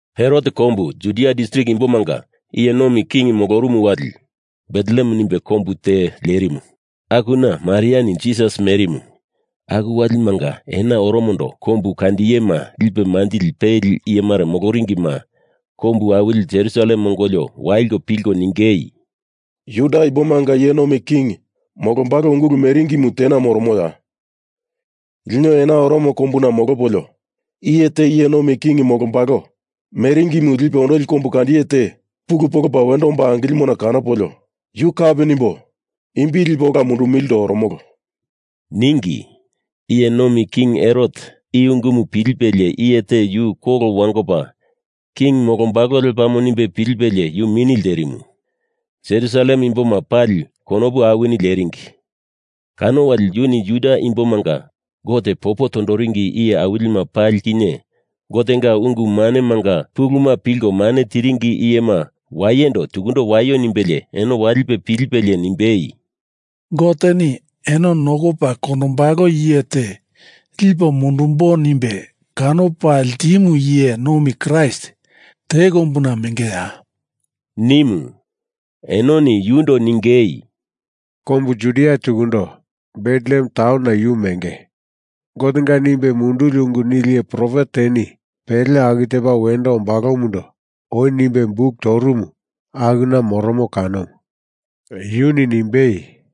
Herot kombu Judia distrik imbomanga iye nomi king molorumu wali Betlehem nimbe kombu taun te lerimu akuna Mariani Jisas merimu. Aku walimanga ena oromondo kombu kandiyema lipe manjili peli iye mare moloringima kombu awili Jerusalem ongolio waliko pilko ningei, “Juda imbomanga iye nomi king molombalo ungulu meringimu tena moromoya? Lino ena oromondo kombuna molopolio iye te iye nomi king molombalo meringimu lipe ondoli kombukandiye te pulu polopa wendo omba angilimona kanopolio, yu kapi nimbo imbi lipo ola mundumilindo oromolo,” ningi. Iye nomi king Herot i ungumu pilipelie iye te yu kolo wangopa king molombalo lepamo nimbe pilipelie yu mini lterimu. Jerusalem imboma pali konopu awini leringi. Kano wali yuni Juda imbomanga Gote popo tondoringi iye awilima pali kinye Gotenga ungu manemanga puluma pilko mane tiringi iyema wayendo tukundo waio nimbelie eno walipe pilipelie nimbei, “Goteni eno nokopa kondombalo iye te lipo mundumbo nimbe kanopa ltimu iye nomi Kraist te kombuna mengeya?” nimu. Enoni yundo ningei, “Kombu Judia tukundo Betlehem taunona yu menge. Gotenga nimbe munduli ungu nili iye profet teni pele aku tepa wendo ombalomundo oi nimbe buk torumu akuna moromo kanomu. Yuni nimbei,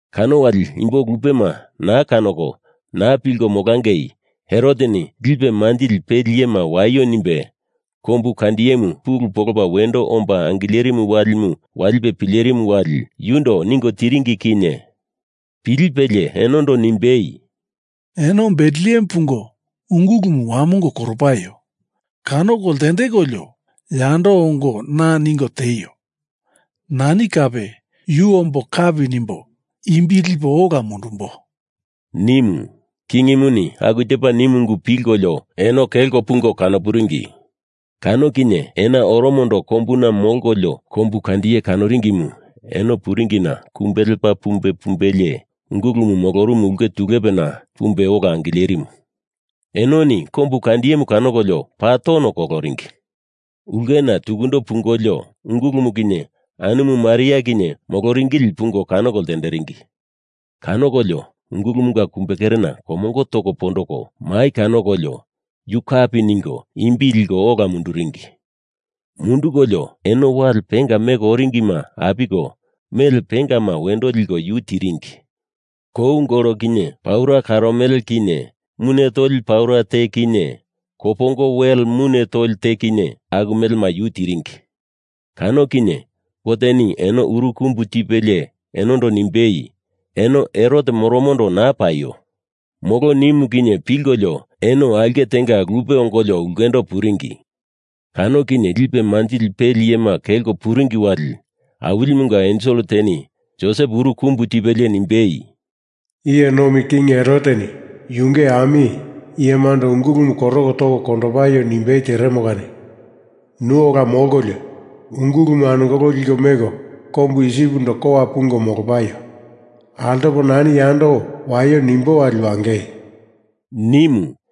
Kano wali imbo lupema naa kanoko naa pilko molangei Heroteni lipe manjili peli iyema waio nimbe kombu kandiyemu pulu polopa wendo omba angilerimu walimu walipe pilerimu wali, yundo ningo tiringi kinye pilipelie enondo nimbei, “Eno Betlehem pungo ungulumu wamongo koro paio! Kanoko ltendekolio yando ongo na ningo tieio. Nani kape yu ombo kapi nimbo imbi lipo ola mundumbo,” nimu. Kingimuni aku tepa nimu ungu pilkolio eno kelko pungo kano puringi. Kano kinye ena oromondo kombuna molkolio kombukandiye kanoringimu eno puringina kumbe lepa pumbei pumbelie ungulumu molorumu ulke tulepena pumbe ola angilerimu. Enoni kombukandiyemu kanokolio paa tono koloringi. Ulkena tukundo pungolio ungulumu kinye anumu Maria kinye moloringili pungo kanoko ltenderingi. Kanokolio ungulumunga kumbekerena komongo toko pondoko mai kanokolio yu kapi ningo imbi liko ola munduringi. Mundukolio eno wale penga meko oringima apiko mele pengama wendo liko yu tiringi. Kou gol kinye, paura karomele kinye mune toli paura te kinye, kopongo wel mune toli te kinye, aku melema yu tiringi. Kano kinye Goteni eno uru kumbu tipelie enondo nimbei, eno Herot moromondo naa paio, molo nimu kinye pilkolio eno aulke tenga lupe ongolio ulkendo puringi. Kano kinye lipe manjili peli iyema kelko puringi wali Awilimunga ensel teni Josep uru kumbu tipelie nimbei, “Iye nomi king Heroteni yunge ami iyemando ungulumu koroko toko kondopaio nimbei teremo kani nu ola molkolio ungulumu anungolo liko meko kombu Isipindo kowa pungo molopaio. Altopo nani yando waio nimbo wali wangei,” nimu.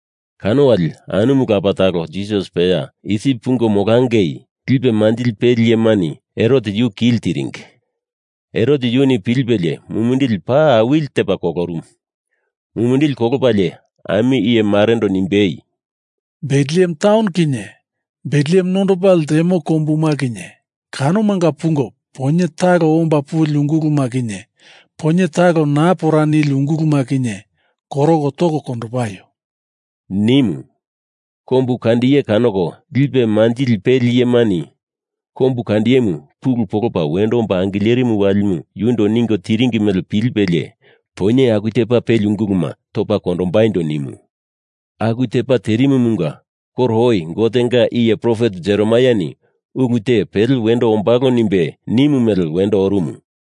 Kano wali anumu lapa talo Jisas peya Isip pungo molangei, lipe manjili peli iyemani Herot yu kili tiringi Herot yuni pilipelie mumindili paa awili tepa kolorumu. Mumindili kolopalie ami iye marendo nimbei, “Betlehem taun kinye Betlehem nondopa ltemo kombuma kinye kanomanga pungo poinye talo omba puli unguluma kinye poinye talo naa pora nili unguluma kinye koroko toko kondopaio!” nimu. Kombukandiye kanoko lipe manjili peli iyemani kombukandiyemu pulu polopa wendo omba angilerimu walimu yundo ningo tiringi mele pilipelie poinye aku tepa peli unguluma topa kondombaindo nimu. Aku tepa terimumunga koro oi Gotenga iye profet Jeremaiani ulu te pele wendo ombalo nimbe nimu mele wendo orumu.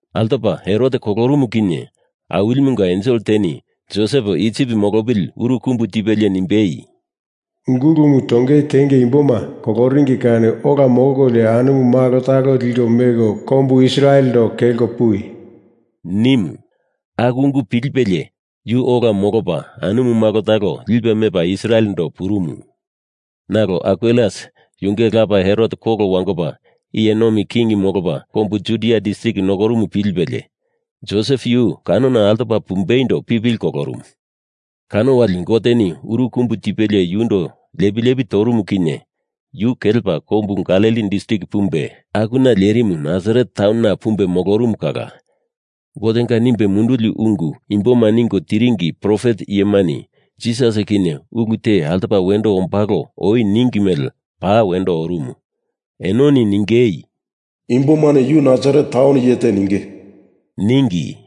Altopa Herot kolorumu kinye Awilimunga ensel teni Josep Isip molopili uru kumbu tipelie nimbei, “Ungulumu tongei tenge imboma koloringi kani ola molko anumu malo talo liko meko kombu Israelendo kelko puwi,” nimu. Aku ungu pilipelie yu ola molopa anumu malo talo lipe mepa Israelendo purumu. Nalo Arkelaus yunge lapa Herot kolo wangopa iye nomi kingimu molopa kombu Judia distrik nokorumu pilipelie Josep yu kanona altopa pumbeindo pipili kolorumu. Kano wali Goteni uru kumbu tipelie yundo lepi lepi torumu kinye yu kelepa kombu Galili distrik pumbe, akuna lerimu Nasaret taunona pumbe molorumu kala Gotenga nimbe munduli ungu imboma ningo tiringi profet iyemani Jisas kinye ulu te altopa wendo ombalo oi ningi mele paa wendo orumu. Enoni ningei, Imbomani Yu Nasaret taun iye te ninge, ningi.